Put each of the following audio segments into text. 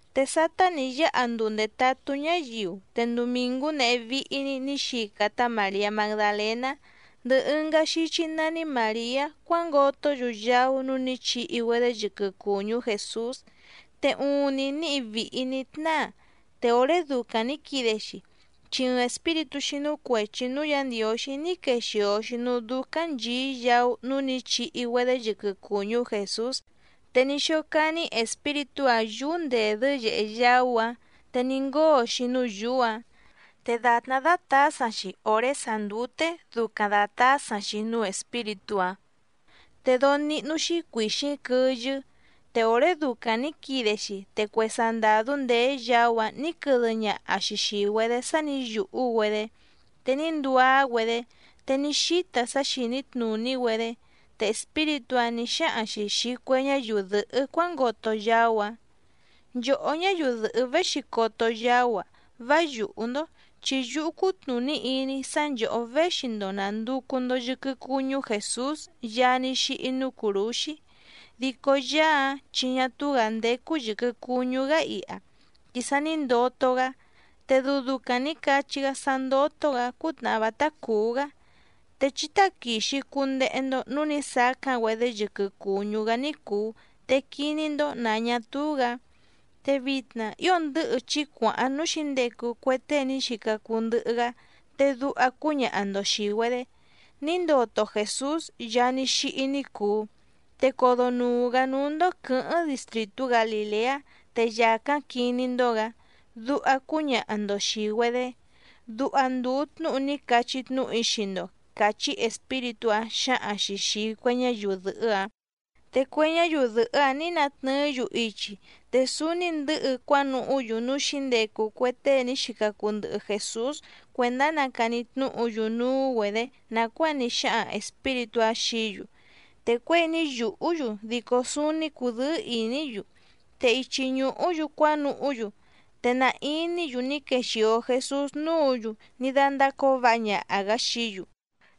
Te sátá nǐ yáha nduu ndètatú ñáyiu, te ndumìngú nehé víhí‑ní nǐ xica tá Màriá Magdalèná ndɨhɨ ɨngá xíchí nání Màriá cuángotó‑yu yaú núú nǐ chihi‑güedé yɨquɨ cùñú Jèsús. Te uuⁿni níhi vìhi ní tnáa, te òré ducaⁿ nǐ quide‑xi chi ɨɨⁿ espíritú xínú cuèchi núú Yǎ Ndiǒxí ní quexìo‑xi núú dúcáⁿ nchìí yaú núú nǐ chihi‑güedé yɨquɨ cùñú Jèsús, te ní xócání espíritú‑áⁿ yǔú ndèdɨ́ yèhe yaú‑áⁿ te ní ngóo‑xi núú yǔú‑ǎⁿ. Te dàtná dátǎsaⁿ‑xi òré sàá ndúté dùcaⁿ datásaⁿ‑xi núú espíritú‑áⁿ, te dóó níhnú‑xí cuìxíⁿ quɨyɨ́. Te òré ducaⁿ nǐ quide‑xi te cue sandàdú ndèé yaú‑áⁿ nǐ quɨdɨ ñaha‑xi xìi‑güedé sá nǐ yùhú‑güedé, te ní nduá‑güedé, te ní xíta sá xìní tnùní‑güedé. Te espíritú‑áⁿ nǐ xáhaⁿ‑xi xìi cue ñáyiu dɨ̀hɨ́ cuángoto yaú‑áⁿ: —Nchòhó ñáyiu dɨ̀hɨ́ véxi coto yaú‑a, vá yùhú‑ndó chi yúhú cútnùní iní‑í sá nchòhó véxi‑ndo nànducu‑ndo yɨquɨ cuñú Jèsús Yaá ní xíhí núú cùrúxí. Dico Yaá‑áⁿ chi ñá túú‑gǎ ndécú yɨ̀quɨ cuñú‑gá iha, chi sa ní ndoto‑gá, te dɨu ducaⁿ nǐ cachí‑gá sá ndótó‑gǎ cútnàhá vátá cùú‑gá, te chí táquìxi cundehe‑ndo núú nǐ sacáⁿ‑güedé yɨquɨ cùñú‑gá ní cùu te quiní‑ndó nǎ ñá túú‑gǎ. Te vitna ío ndɨ̌hɨ chí cuàháⁿ núú xǐndecu cue tée ní xica cuu ndɨhɨ‑gá, te duha cúñaha‑ndo xìi‑güedé: “Ní ndoto Jèsús Yaá ní xíhí ní cùu, te codonùu‑gá núú‑ndó quɨ̌hɨ́ⁿ distrìtú Galìleá te yàcáⁿ quiní‑ndó‑gǎ”, duha cúñaha‑ndo xìi‑güedé. Duha ndùu tnúhu ní cachí tnúhu‑í xii‑ndo —càchí espíritú‑áⁿ xǎhaⁿ‑xi xìi cue ñáyiu dɨ̀hɨ́‑áⁿ. Te cue ñáyiu dɨ̀hɨ́‑áⁿ nǐ natnɨɨ́‑yu ichi, te súúní ndɨ̌hɨ cuánuhú‑yu núú xǐndecu cue tée ní xica cuu ndɨhɨ Jèsús cuèndá nacani tnúhu‑yu núú‑güedě nàcuáa ní xáhaⁿ espíritú‑áⁿ xií‑yu, te cuěi ní yùhú‑yu dico súúní cùdɨ́ɨ́ ìní‑yu. Te ichi ñùhú‑yu cuánuhú‑yu, te na iní‑yu ní quexìo Jesús núǔ‑yu ní dándácǒo váha ñaha‑gǎ xií‑yu.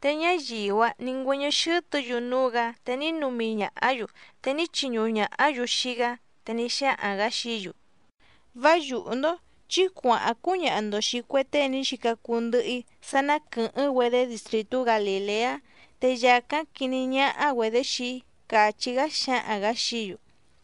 Te ñáyiu‑áⁿ nǐ ngüɨ́ñɨ́ xɨ́tɨ̌‑yu núú‑gǎ, te ní numi ñàhá‑yu xii‑gá, te ní chiñuhu ñàhá‑yu. Te ní xáhaⁿ‑gǎ xií‑yu: —Vá yùhú‑ndó, chí cuàháⁿ cúñaha‑ndo xìi cue tée ní xica cuu ndɨhɨ‑í sá ná quɨ̀hɨ́ⁿ‑güedé distrìtú Galìleá, te yàcáⁿ quiní ñáhá‑güedě xii‑í —càchí‑gá xǎhaⁿ‑gǎ xií‑yu.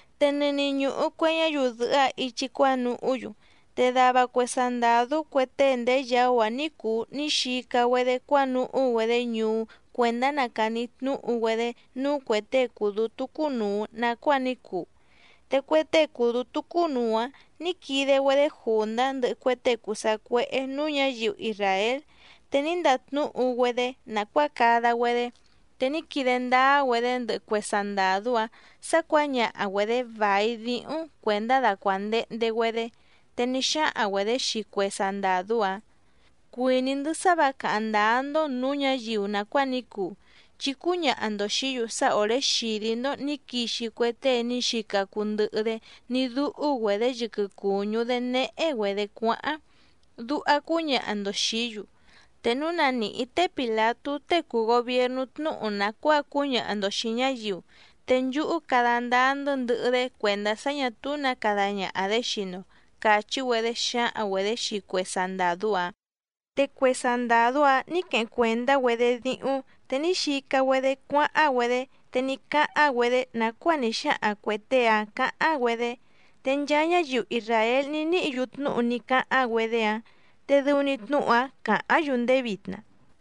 Te nɨni ñùhu cue ñáyiu dɨ̀hɨ́‑áⁿ ichi cuánuhú‑yu, te dava cue sandàdú cue tée ndèé yaú‑áⁿ ní cùu ní xica‑güedé cuánuhú‑güedé ñuú cuèndá nacani tnúhu‑güedé núú cuè tée cùu dútú cúnùu nacuáa ní cuu. Te cue tée cùu dútú cúnùu‑áⁿ nǐ quide‑güedé jùndá ndɨhɨ cue tée cùu sacuéhé nǔú ñǎyiu isràél, te ní ndatnúhu‑güedé nàcuáa cada‑güedé, te ní quide ndáá‑güedé ndɨhɨ cue sandàdú‑áⁿ sǎ cuǎñaha‑güedě vài díhúⁿ cuèndá dacuàndehnde‑güedé. Te ní xáhaⁿ‑güedě xii cue sandàdú‑áⁿ: —Cuìní‑ndɨ́ sá vǎ càháⁿ ndáá‑ndó nǔú ñǎyiu nàcuáa ní cuu, chi cúñaha‑ndo xìí‑yu sá òré xìdí‑ndó nǐ quixi cue tée ní xica cuu ndɨhɨ‑dé ní dúhú‑güedě yɨquɨ cùñú‑dé néhé‑güedě cuáháⁿ, duha cúñaha‑ndo xìí‑yu. Te núu na nìhí té Pìlatú tée cùu gobiernú tnúhu nàcuáa cúñaha‑ndo xìi ñáyiu, te nchúhú cada ndáá‑ndɨ́ ndɨhɨ‑dé cuèndá sá ñà túú nǎ cada ñaha‑dě xii‑ndo —càchí‑güedé xǎhaⁿ‑güedě xii cue sandàdú‑áⁿ. Te cue sandàdú‑áⁿ nǐ queheⁿ cuèndá‑güedé díhúⁿ, te ní xica‑güedé cuáháⁿ‑güedé te ní cáháⁿ‑güedé nàcuáa ní xáhaⁿ cuè tée‑áⁿ cǎháⁿ‑güedé. Te nchaa ñáyiu isràél ní níhǐ‑yu tnúhu ní cáháⁿ‑güedé‑áⁿ, te dɨu‑ni tnúhu‑áⁿ càháⁿ‑yu ndéé vitna.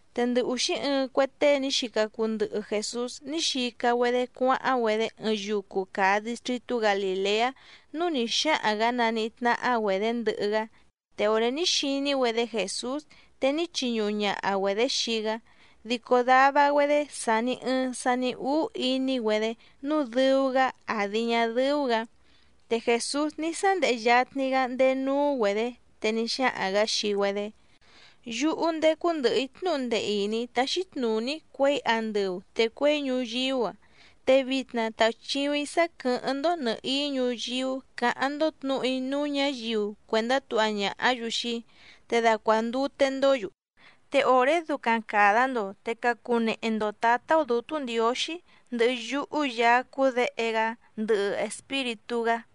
Te ndɨ ùxí ɨɨⁿ cue tée ní xica cuu ndɨhɨ Jèsús ní xica‑güedé cuáháⁿ‑güedé ɨɨⁿ yucu càa distritú Galìleá núú nǐ xáhaⁿ‑gǎ naníhí tnáhá‑güedě ndɨhɨ‑gá. Te òré ní xiní‑güedé Jèsús te ní chiñuhu ñaha‑güedě xii‑gá, dico dava‑güedé sàni ɨɨⁿ sani úú iní‑güedé nǔu dɨu‑gá àdi ñá dɨ́ú‑gǎ. Te Jèsús ní sándehe yatni‑gá ndéé núú‑güedě, te ní xáhaⁿ‑gǎ xii‑güedé: —Yúhú ndécú ndɨ̀hɨ‑í tnúhu ndee ìní táxí tnùní‑í cuěi andɨu te cuěi ñuyíú‑a. Te vitna tàuchiuⁿ‑í sá quɨ̀hɨ́ⁿ‑ndó nɨ̀hií ñuyíú cǎháⁿ‑ndó tnǔhu‑í núú ñǎyiu cuèndá tuha ñàhá‑yu xii‑í, te dacuàndute‑ndó‑yu. Te òré ducaⁿ càda‑ndo, te cacunehe‑ndo tǎtá‑ó Dǔtú Ndiǒxí ndɨhɨ yúhú Yaá cúú Děhe‑gá ndɨhɨ Espíritú‑gá.